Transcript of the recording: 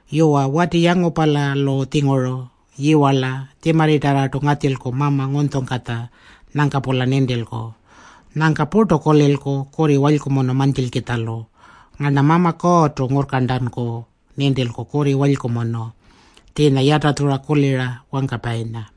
Yuwa, wati yangupalalu-tjinguru yiwarla puru tjimarritarrartu ngatjilku mama ngunytjungkatja nyangka-pula nintilku. Nyangka purtu kulilku kurri walykumunu mantjilkitjalu. Ngarna Mama Kuurrtu ngurrkarntanku nintilku kurri walykumunu, tjiinya yatatjura kulira wangkapayinya.